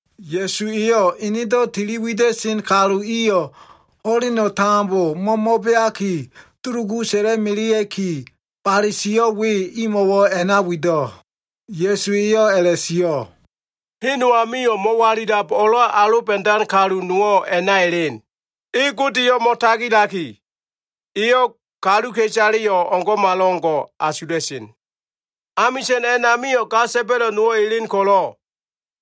Ya꞉su eyo꞉ enedo꞉ tili wida꞉sen kalu iyo꞉ ho꞉leno꞉ tambo mo꞉mo꞉beaki dulugu sa꞉la꞉melea꞉ki, bale sio꞉ we imo꞉wo꞉ a꞉na wido꞉. Ya꞉su eyo꞉ a꞉la꞉sio꞉, “Hen no amio꞉ mo꞉walilab o꞉lo꞉ aloba꞉dan kalu nowo꞉ a꞉na elen. E Godeyo꞉ mo꞉tagilaki, eyo꞉ kaluka꞉isaleyo꞉ o꞉ngo꞉malo꞉ngo꞉ asula꞉sen. Amisa꞉n a꞉namio꞉ ga sa꞉ba꞉lo꞉ nowo꞉ elen ko꞉lo꞉,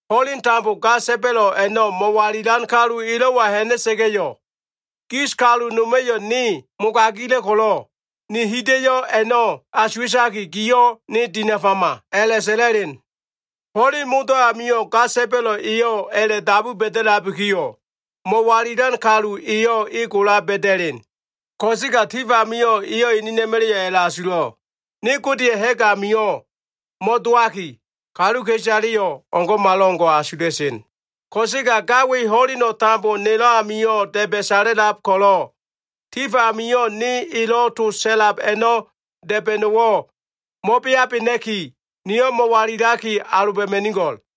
ho꞉leno꞉ tambo ga sa꞉ba꞉lo꞉ a꞉no꞉ mo꞉walilan kalu elo꞉wa ha꞉na꞉sa꞉ga꞉yo꞉, ‘gis kalu noma꞉yo꞉ ne mogagila꞉ ko꞉lo꞉ ne hida꞉yo꞉ a꞉no꞉ asuwa꞉taki, giyo꞉ ne dinafama’ a꞉la꞉sa꞉la꞉len. Ho꞉len modo꞉ amio꞉ ga sa꞉ba꞉lo꞉ eyo꞉ a꞉la꞉dabu ba꞉da꞉labikiyo꞉, mo꞉walilan kalu eyo꞉ e gola ba꞉da꞉len. Ko꞉sega tif amio꞉ eyo꞉ enena꞉ma꞉la꞉yo꞉ a꞉la꞉asulo꞉, ‘Ne Godeya꞉ ha꞉g amio꞉ mo꞉dowaki, kaluka꞉isaleyo꞉ o꞉ngo꞉malo꞉ngo꞉ asula꞉sen. Ko꞉sega ga we ho꞉leno꞉ tambo nelo꞉ amio꞉ da꞉ba꞉ sala꞉lab ko꞉lo꞉, tif amio꞉ ne elo꞉ to sa꞉la꞉lab a꞉no꞉ da꞉ba꞉no꞉wo꞉ mo꞉beabena꞉ki, niyo꞉ mo꞉walilaki aloba꞉ma꞉nigo꞉l.’”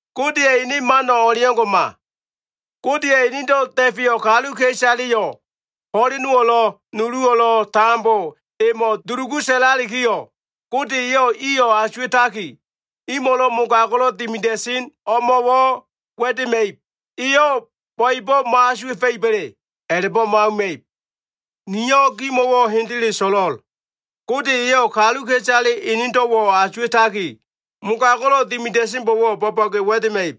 Godeya꞉ ene mano꞉ o꞉leo꞉ngo꞉ma. Godeya꞉ enedo꞉ da꞉feyo꞉ kaluka꞉isaleyo꞉ ho꞉lenowo꞉lo꞉, nuluwo꞉lo꞉ tambo emo꞉ dulugu sa꞉lalikiyo꞉, Gode eyo꞉ iyo꞉ asuwa꞉taki, imo꞉lo꞉ mogago꞉lo꞉ dimida꞉sen o꞉mo꞉wo꞉ wa꞉dema꞉ib. Eyo꞉ bo꞉ebo꞉ mo꞉asuwa꞉fa꞉iba꞉le? A꞉la꞉bo꞉ mo꞉auma꞉ib. Niyo꞉ gimo꞉wo꞉ hendele so꞉lo꞉l. Gode eyo꞉ kaluka꞉isale enedo꞉wo꞉ asuwa꞉taki, mogago꞉lo꞉ dimida꞉senbo꞉wo꞉ bo꞉bo꞉ge wa꞉dema꞉ib.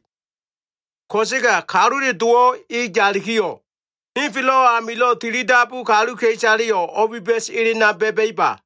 Ko꞉sega Kalule Dowo꞉ e yalikiyo꞉, henfelo꞉ amilo꞉ tilidabu kaluka꞉isaleyo꞉ o꞉biba꞉s elena ba꞉ba꞉iba?”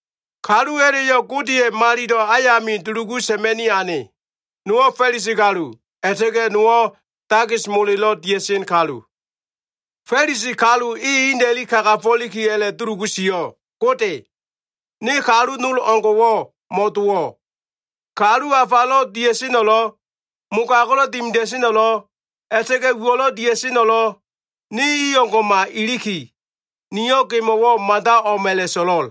“Kalu a꞉la꞉yo꞉ Godeya꞉ malilo꞉ ayami dulugu sa꞉ma꞉ni ane. Nowo꞉ Fa꞉lisi kalu, a꞉la꞉ta꞉ga꞉ nowo꞉ takis molelo꞉ dia꞉sen kalu. Fa꞉lisi kalu e ina꞉li kagafo꞉liki a꞉la꞉dulugu sio꞉, ‘Gode, ne kalu nol o꞉ngo꞉wo꞉ mo꞉dowo꞉. Kalu afalo꞉ dia꞉seno꞉lo꞉, mogago꞉lo꞉ dimida꞉seno꞉lo꞉, a꞉la꞉ta꞉ga꞉ uwo꞉lo꞉ dia꞉seno꞉lo꞉, ne i o꞉ngo꞉ma iliki, niyo꞉ gemo꞉wo꞉ mada o꞉m a꞉la꞉so꞉lo꞉l.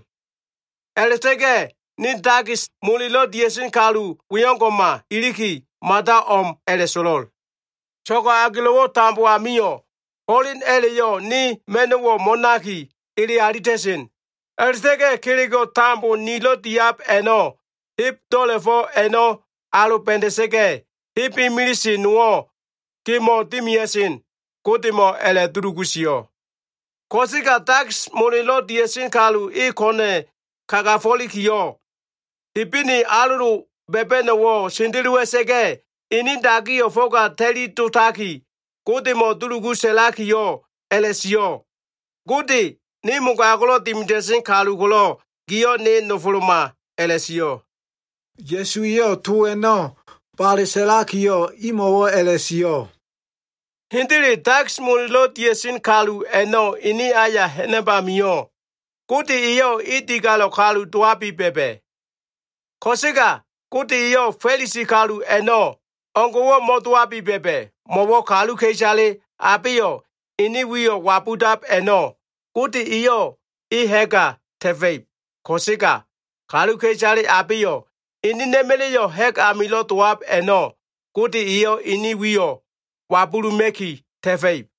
A꞉la꞉ta꞉ga꞉ ne takis molelo꞉ dia꞉sen kalu we o꞉ngo꞉ma iliki, mada o꞉m a꞉la꞉so꞉lo꞉l. So꞉go꞉ agelo꞉wo꞉ tambo amio꞉, ho꞉len a꞉la꞉yo꞉ ne ma꞉no꞉wo꞉ mo꞉naki ele alita꞉sen. A꞉la꞉ta꞉ga꞉ kelego꞉ tambo nilo꞉ diab a꞉no꞉ heb do꞉la꞉fo꞉ a꞉no꞉ aloba꞉da꞉sa꞉ga꞉, heb imilise nowo꞉ gemo꞉ dimia꞉sen’ Godemo꞉ a꞉la꞉dulugu sio꞉. Ko꞉sega takis molelo꞉ dia꞉sen kalu e ko꞉na꞉ kagafo꞉likiyo꞉, Hebene alolo ba꞉ba꞉no꞉wo꞉ sendelowa꞉sa꞉ga꞉, ene dagiyo꞉ fo꞉ga ta꞉li dotaki, Godemo꞉ dulugu sa꞉lakiyo꞉ a꞉la꞉sio꞉, ‘Gode ne mogago꞉lo꞉ dimida꞉sen kalu ko꞉lo꞉, giyo꞉ ne nofoloma’ a꞉la꞉sio꞉.” Ya꞉su eyo꞉ to a꞉no꞉ bale sa꞉lakiyo꞉, imo꞉wo꞉ a꞉la꞉sio꞉, “Hendele, takis molelo꞉ dia꞉sen kalu a꞉no꞉ ene aya ha꞉nab amio꞉, Gode eyo꞉ e digalo꞉ kalu dowabi ba꞉ba꞉. Ko꞉sega Gode eyo꞉ Fa꞉lisi kalu a꞉no꞉ o꞉ngo꞉wo꞉ mo꞉dowabi ba꞉ba꞉. Mo꞉wo꞉ kaluka꞉isale abeyo꞉ enen wiyo꞉ wabudab a꞉no꞉, Gode eyo꞉ e ha꞉ga ta꞉fa꞉ib. Ko꞉sega kaluka꞉isale abeyo꞉ enena꞉ma꞉la꞉yo꞉ ha꞉g amilo꞉ dowab a꞉no꞉, Gode eyo꞉ ene wiyo꞉ wabuluma꞉ki ta꞉fa꞉ib.”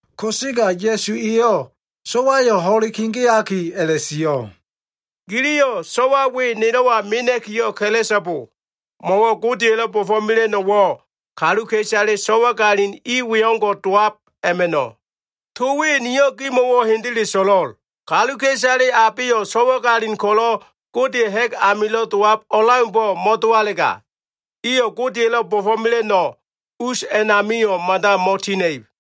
Ko꞉sega Ya꞉su eyo꞉ so꞉wayo꞉ ho꞉le kegeaki, a꞉la꞉sio꞉, “Giliyo꞉ so꞉wa i we nelo꞉wa mena꞉ki ka꞉la꞉so꞉bo. Mo꞉wo꞉ Godeya꞉lo꞉ bo꞉fo꞉mela꞉no꞉wo꞉ kaluka꞉isale so꞉wagalin i we o꞉ngo꞉ dowab a꞉ma꞉no꞉. To we niyo꞉ gimo꞉wo꞉ hendele so꞉lo꞉l. Kaluka꞉isale abeyo꞉ so꞉wagalin ko꞉lo꞉ Godeya꞉ ha꞉g amilo꞉ dowab o꞉leaumbo꞉ mo꞉dowalega, iyo꞉ Godeya꞉lo꞉ bo꞉fo꞉mela꞉no꞉ us a꞉namio꞉ mada mo꞉tina꞉ib.”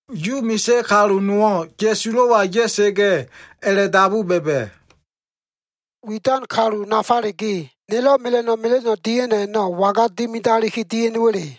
Yu misa꞉ kalu nowo꞉ Ya꞉sulo꞉wa ya꞉sa꞉ga꞉, a꞉la꞉dabu ba꞉ba꞉, “Widan kalu nafaleyo꞉ ge, nilo꞉ mela꞉no꞉ mela꞉no꞉ dia꞉no꞉ a꞉no꞉ waga dimidaliki dia꞉no꞉wa꞉le?”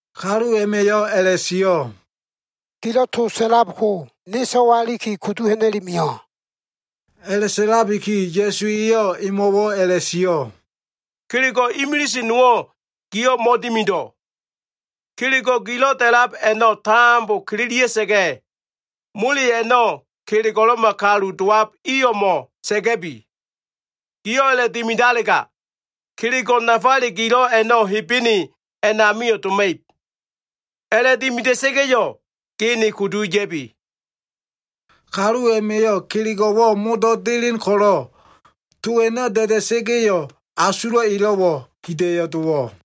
Kalu a꞉ma꞉yo꞉ a꞉la꞉sio꞉, “Gilo꞉ to sa꞉lab ko ne so꞉wa iliki kudu ha꞉na꞉i mio꞉.” A꞉la꞉sa꞉labiki Ya꞉su eyo꞉ emo꞉wo꞉ a꞉la꞉sio꞉, “Kelego꞉ imilise nowo꞉ giyo꞉ mo꞉dimido꞉. Kelego꞉ gilo꞉ da꞉lab a꞉no꞉ tambo kililia꞉sa꞉ga꞉, mole a꞉no꞉ kelego꞉lo꞉ma kalu dowab i o꞉mo꞉ sa꞉ga꞉bi. Giyo꞉ a꞉la꞉dimidalega, kelego꞉ nafale gilo꞉ a꞉no꞉ Hebene a꞉namio꞉ doma꞉ib. A꞉la꞉dimida꞉sa꞉ga꞉yo꞉, ge ne kudu ya꞉bi.” Kalu a꞉ma꞉yo꞉ kelego꞉wo꞉ modo꞉ delen ko꞉lo꞉, to a꞉no꞉ da꞉da꞉sa꞉ga꞉yo꞉, asulo꞉ elo꞉wo꞉ hida꞉yo꞉ dowo꞉.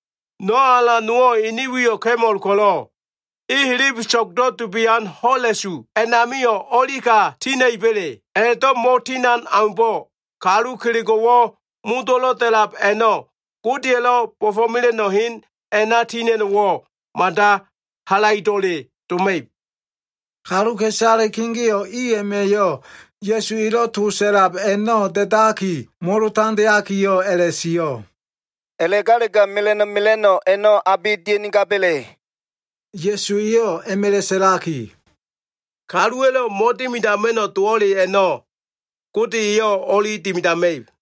No꞉ alan nowo꞉ ene wiyo꞉ ka꞉mol ko꞉lo꞉, e helebeso꞉gdo꞉ dubian ho꞉la꞉su a꞉namio꞉ o꞉lika tina꞉iba꞉le? A꞉la꞉do꞉ mo꞉tinan aumbo꞉, kalu kelego꞉wo꞉ modo꞉lo꞉ da꞉lab a꞉no꞉ Godeya꞉lo꞉ bo꞉fo꞉mela꞉no꞉ hen a꞉na tina꞉no꞉wo꞉, mada halaido꞉le doma꞉ib.” Kaluka꞉isale kegeo꞉ i a꞉ma꞉yo꞉ Ya꞉su elo꞉ to sa꞉lab a꞉no꞉ da꞉daki, molo tandeakiyo꞉ a꞉la꞉sio꞉, “A꞉la꞉galega mela꞉no꞉ mela꞉no꞉ a꞉no꞉ abe dia꞉nigaba꞉le?” Ya꞉su eyo꞉ a꞉ma꞉la꞉ sa꞉laki, “Kaluwa꞉lo꞉ mo꞉dimidama꞉no꞉ dowo꞉le a꞉no꞉, Gode eyo꞉ o꞉li dimidama꞉ib.”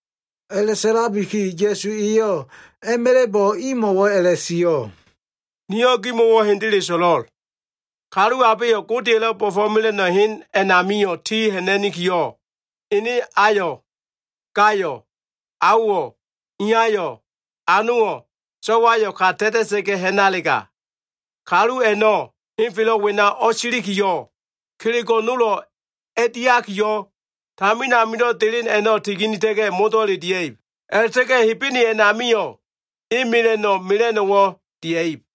A꞉la꞉sa꞉labiki Ya꞉su eyo꞉ a꞉ma꞉la꞉bo꞉ imo꞉wo꞉ a꞉la꞉sio꞉, “Niyo꞉ gimo꞉wo꞉ hendele so꞉lo꞉l. Kalu abeyo꞉ Godeya꞉lo꞉ bo꞉fo꞉mela꞉no꞉ hen a꞉namio꞉ ti ha꞉na꞉nikiyo꞉, ene ayo꞉, gayo꞉, aowo꞉, iyayo꞉, anowo꞉, so꞉wayo꞉ ka ta꞉ta꞉ga꞉ ha꞉nalega, kalu a꞉no꞉ henfelo꞉ wena o꞉silikiyo꞉, kelego꞉ nolo꞉ a꞉diakiyo꞉, tamin amilo꞉ delen a꞉no꞉ tiginita꞉ga꞉, modo꞉le dia꞉b. A꞉la꞉ta꞉ga꞉ Hebene a꞉namio꞉, e mela꞉no꞉ mela꞉no꞉wo꞉ dia꞉ib.”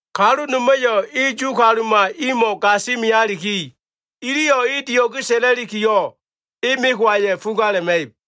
Kalu noma꞉yo꞉ e Yu kaluma imo꞉wo꞉ gasi mealiki, iliyo꞉ e dio꞉ge sa꞉la꞉likiyo꞉, e mekowaya꞉ fugala꞉ma꞉ib.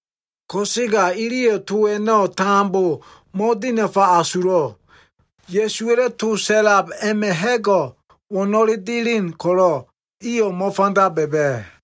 Ko꞉sega iliyo꞉ to a꞉no꞉ tambo mo꞉dinafa asulo꞉. Ya꞉suwa꞉lo꞉ to sa꞉lab a꞉ma꞉ ha꞉go꞉ wo꞉no꞉le delen ko꞉lo꞉, iyo꞉ mo꞉fanda ba꞉ba꞉.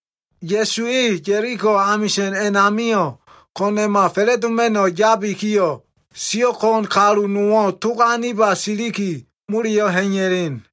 Ya꞉su e Ya꞉liko amisa꞉n a꞉namio꞉ ko꞉na꞉ma fa꞉la꞉doma꞉no꞉ yabikiyo꞉, siyo꞉ ko꞉n kalu nowo꞉ tog aniba siliki, moleyo꞉ ha꞉iya꞉len.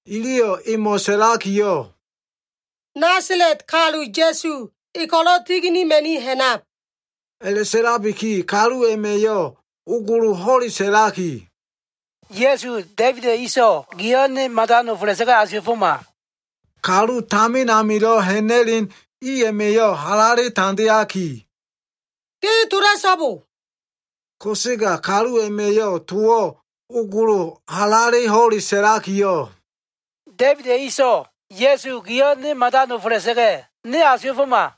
Iliyo꞉ emo꞉ sa꞉lakiyo꞉, “Nasala꞉t kalu Ya꞉su e ko꞉lo꞉ tiginima꞉ni ha꞉nab.” A꞉la꞉sa꞉labiki kalu a꞉ma꞉yo꞉ ogolo ho꞉le sa꞉laki, “Ya꞉su, Da꞉ibida꞉ inso꞉ giyo꞉ ne mada nofola꞉sa꞉ga꞉ asuwa꞉foma.” Kalu tamin amilo꞉ ha꞉na꞉len i a꞉ma꞉yo꞉ halale tandeaki “Ge tola꞉so꞉bo!” Ko꞉sega kalu a꞉ma꞉yo꞉ towo꞉ ogolo halale ho꞉le sa꞉lakiyo꞉, “Da꞉ibida꞉ inso꞉, Ya꞉su giyo꞉ ne mada nofola꞉sa꞉ga꞉, ne asuwa꞉foma!”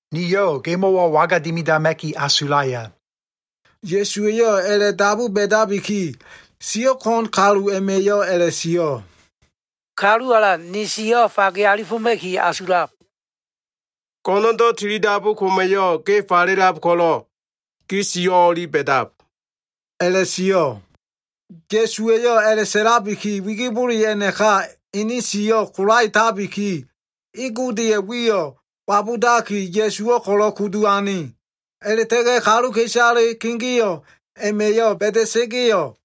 “Niyo꞉ gemo꞉wo꞉ waga dimidama꞉ki asulaya?” Ya꞉suwa꞉yo꞉ a꞉la꞉dabu ba꞉dabiki, siyo꞉ ko꞉n kalu a꞉ma꞉yo꞉ a꞉la꞉sio꞉, “Kalu Alan, ni siyo꞉ fage alifoma꞉ki asulab.” “Go꞉no꞉ndo꞉ tilidabu koma꞉yo꞉ ge falelab ko꞉lo꞉, gi siyo꞉ o꞉li ba꞉dab” a꞉la꞉sio꞉. Ya꞉su eyo꞉ a꞉la꞉sa꞉labiki, wigibole a꞉naka ene siyo꞉ kolaetabiki, e Godeya꞉ wiyo꞉ wabudaki, Ya꞉suwo꞉ ko꞉lo꞉ kudu ane. A꞉la꞉ta꞉ga꞉ kaluka꞉isale kegeo꞉ a꞉ma꞉yo꞉ ba꞉da꞉sa꞉ga꞉yo꞉,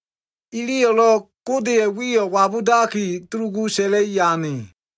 iliyo꞉lo꞉ Godeya꞉ wiyo꞉ wabudaki dulugu sa꞉la꞉i ane.